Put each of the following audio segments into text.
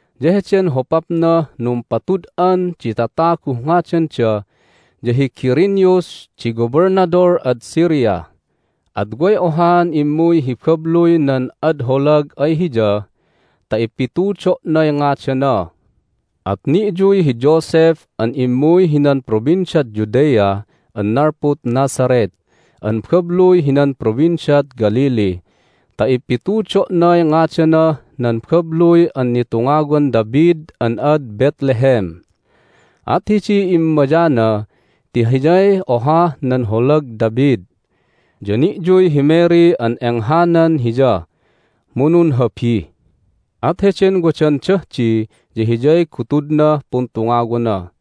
Ya heden hopapnah numpatud'an di tataguh ngadanda ya hi Quirinius di Gobelnadol ad Syria. At way ohaan immuy hi babluy nan ad holag ay hiya ta ipitudo'nay ngadana. At ni'yuy hi Joseph an immuy hinan Provinciad Judea an nalpud Nazareth an babluy hinan Provinciad Galilee ta ipitudo'nay ngadanah nan babluy an nitungawan David an ad Bethlehem. At hidiy immayana ti hiyay ohah nan holag David. Ya ni'yuy hi Mary an enghanan hiya, mu nunhabi. At heden wadandah di ya hiyay gutudnah puntungawana.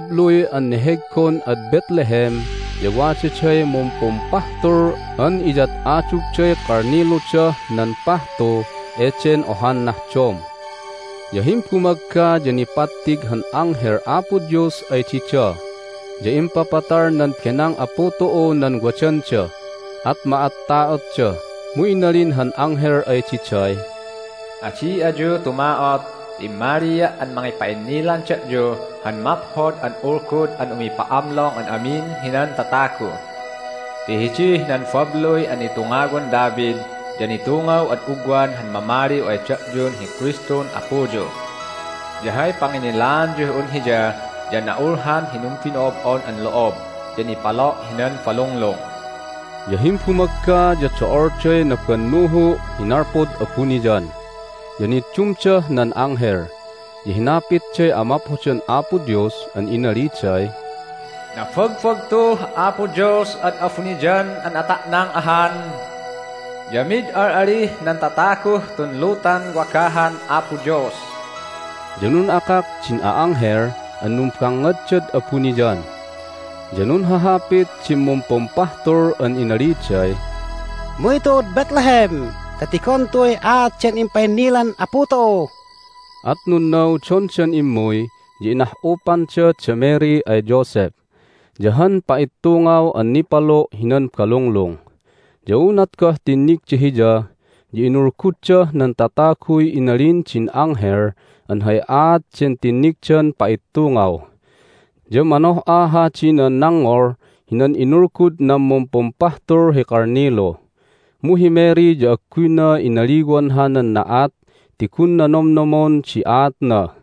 Hidih nan babluy an neheggon ad Bethlehem ya wadaday mumpumpahtul an iyad'adugday kalniludah nan pahtu eden ohan nahdom. Ya himbumagga ya nipattig han anghel Apo Dios ay dida, ya impapatal nan benang Apu tu'u nan wadanda. At ma'atta'otda, mu inalin han anghel ay diday, "Adi ayu tuma'ot! Ti immalia' an mangipa'innilan da'yu han maphod an ulgud an umipa'amlong an amin hinan tatagu! Ti hidih nan babluy an nitungawan David ya nitungaw ad ugwan han Mamaliw ay da'yun hi Kristun Apuyu! Ya hay panginnilaanyuh un Hiya ya na'ulhan hi numbino'ob'on an lo'ob, ya nipalo' hinan balunglung." Ya himbumagga ya do'olday nabannuhu' hi nalpud abuniyan, ya niddumdah nan anghel, ya hinapitday amaphodan Apo Dios an inaliday, "Nabagbagtuh Apo Dios ad abuniyan an ata'nang ahan! Ya mid al'alih nan tataguh tun lutan wagahan Apo Dios!" Ya nun'akak din a'anghel an numbangngaddad abuniyan. Ya nunhahapit din mumpumpahtul an inaliday, "Umuy tu'ud Bethlehem ta tigon tu'uy aat den impa'innilan Apu tu'u!" At nunnaudondan immuy, ya inah'upanda da Mary ay Joseph, ya han pa'ittungaw an nipalo' hinan balunglung. Ya unat goh tinnigda Hiya ya inulguddah nan tataguy inalin din anghel an hay aat den tinnigdan pa'ittungaw. Ya manoh'a hadi nan nangngol hinan inulgud nan mumpumpahtul hi kalnilu. Mu hi Mary ya agguyna inaliwan hanan na'at ti gunna nomnomon di aatna.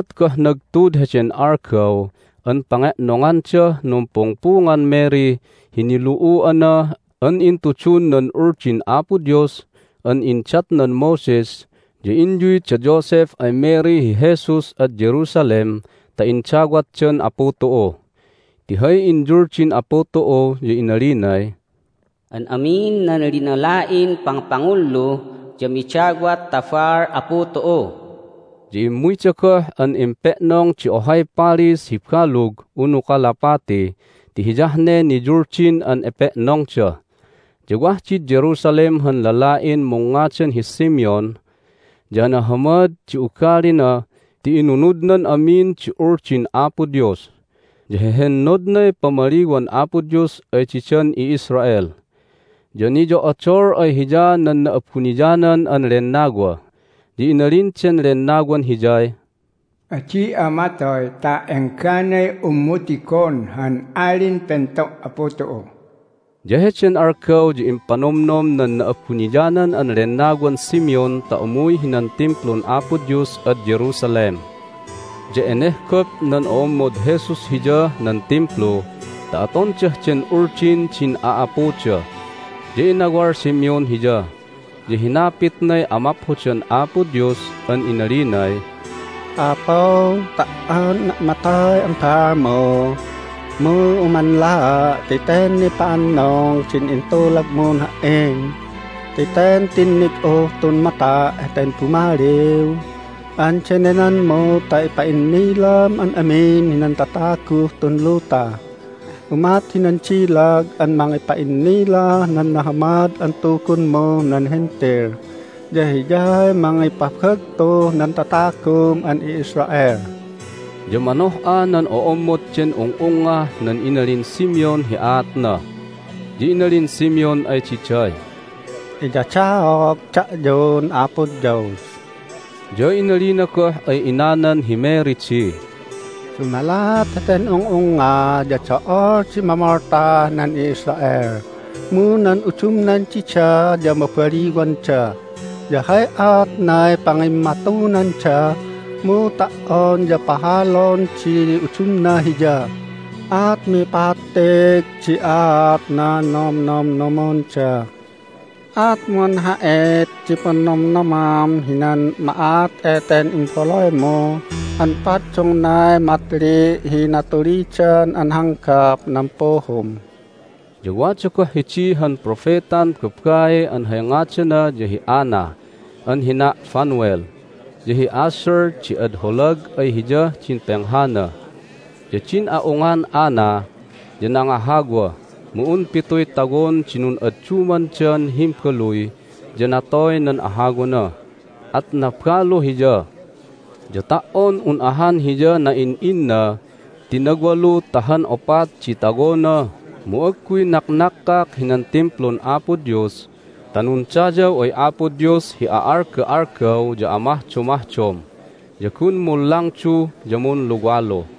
Unat goh nagtud heden algaw an pange'nongandah numpungpungan Mary hi nilu'u'ana an intudun nan Uldin Apo Dios an indatnan Moses ya inyuy da Joseph ay Mary hi Jesus ad Jerusalem ta indawatdan Apu tu'u. Ti hay inyuldin Apu tu'u ya inalinay, "An amin nan linala'in pangpangullu ya midawat ta baal Apu tu'u." Ya immuyda goh an empe'nong di ohay palis hi balug unu kalapati ti hiyah ne niyuldin an epe'nongda. Ya wah did Jerusalem han lala'in mungngadan hi Simeon. Ya nahamad di ugalina ti inunudnan amin di Uldin Apo Dios, ya hehennodnay pamaliwan Apo Dios ay didan i'Israel, ya niyo'odol ay hiya nan Na'abuniyanan an Lennawa. Ya inalin den Lennawan hiyay, "Adi'a matoy ta engganay unmu tigon han Alin Pento' Apu tu'u." Ya heden algaw ya impanomnom nan Na'abuniyanan an Lennawan Simeon ta umuy hinan Timplun Apo Dios ad Jerusalem. Ya enehgop nan o'ommod Jesus Hiyah nan Timplu ta atondah den Uldin din a'apuda, ya inawal Simeon Hiya, ya hinapitnay amaphodan Apo Dios an inalinay, "Apu, ta"on unna' matoy an baalmu mu umanlaa' ti ten nipa'annung din intulagmun ha"in ti ten tinnig'uh tun mata' heten Bumaliw an denenanmu ta ipa'innilam an amin hinan tataguh tun luta. Umat hinan dilag an mangipa'innilah nan Nahamad an Tugunmuh nan Hentil, ya Hiyay mangipabagtuh nan tatagum an i'Israel." Ya manoh'a nan o'ommod den ung'ungngah nan inalin Simeon hi aatna. Ya inalin Simeon ay diday, "Iyadaog da'yun Apo Dios!" Ya inalina goh ay inanan hi Mary di, "Dumalat heten ung'ungnga ya do'ol di mamoltah nan i'Israel, mu nan udumnan dida ya mabaliwanda. Ya hay aatnay pangimmatunanda, mu ta"on ya pahalon di udumna Hiya, at mipattig di aat nan nomnomnomonda. At munha'it di punnomnomam hinan ma'at eten imbaluymu an paddungnay matli' hi natulidan an hanggap nan puhum." Ya wada goh hidi han propetan babai an hay ngadana ya hi Anna an hina' Phanuel, ya hi Asher di ad holag ay hiyah din penghana. Ya din a'ungan Anna ya nangahawa, mu un pituy tawon di nun'addumandan himbaluy, ya natoy nan ahawana, at nabalu hiya. Ya ta"on un ahan hiya na'in'inna ti nawalu ta han opat di tawona mu agguy naknakkak hinan Timplun Apo Dios ta nundayaw ay Apo Dios hi a'alga'algaw ya amahdomahdom, ya gun munlangdu ya munluwalu.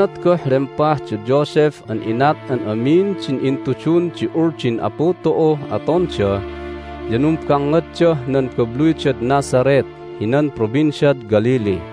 Unat goh lempah da Joseph an inat an amin din intudun di Uldin Apu tu'uh atonda ya numbangngaddah nan babluydad Nazareth hinan Provinciad Galilee.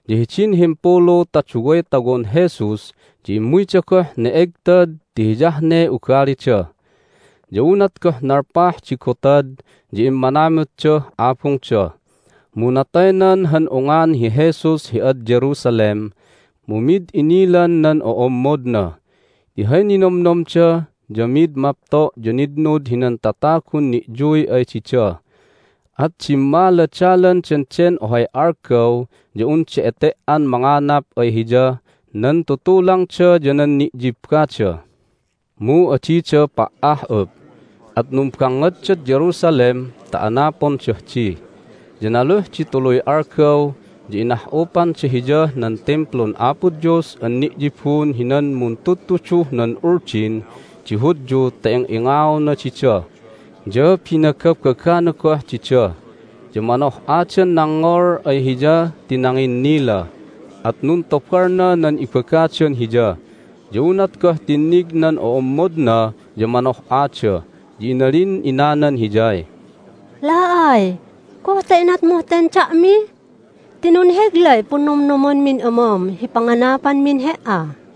Ya hidin himpulu ta duway tawon Jesus ya immuyda goh ne'egtad ti hiyah ne ugalida. Ya unat goh nalpah di gotad ya immanamutdah abungda, mu nataynan han ungan hi Jesus hi ad Jerusalem, mu mid inilan nan o'ommodna ti hay ninomnomda ya mid mapto' ya nitnud hinan tatagun ni'yuy ay dida. At dimmaladalandan den ohay algaw ya unda ete"an manganap ay Hiyah nan tutulangda ya nan ni'yibbada. Mu adida pa"ah'up, at numbangngaddad Jerusalem ta anapondah di. Ya naluh di tuluy algaw ya inah'upanda Hiyah nan Timplun Apo Dios an ni'yibun hinan muntudtuduh nan Uldin di Hudyu ta ing'ingaona dida, ya binagabagana goh dida. Ya manoh'adan nangngol ay Hiya ti nanginnila, at nuntobalna nan ibagadan Hiya. Ya unat goh tinnig nan o'ommodna ya manoh'ada, ya inalin inanan Hiyay, "La'ay, goh ta inatmuh ten da'mi? Ti nunheglay punnomnomanmin amam hi panganapanmin He"a!"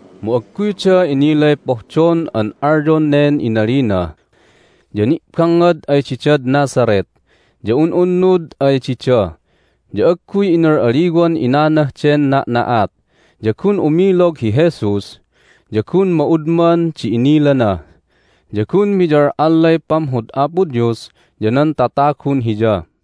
Mu agguyda inilay pohdon an alyon nen inalina. Ya ni'bangngad ay didad Nazareth, ya un'unnud ay dida. Ya agguy inal'alliwan inanah den na'na'at. Ya gun umilog hi Jesus, ya gun ma'udman di inilana, ya gun miyal'allay pamhod Apo Dios ya nan tatagun Hiya.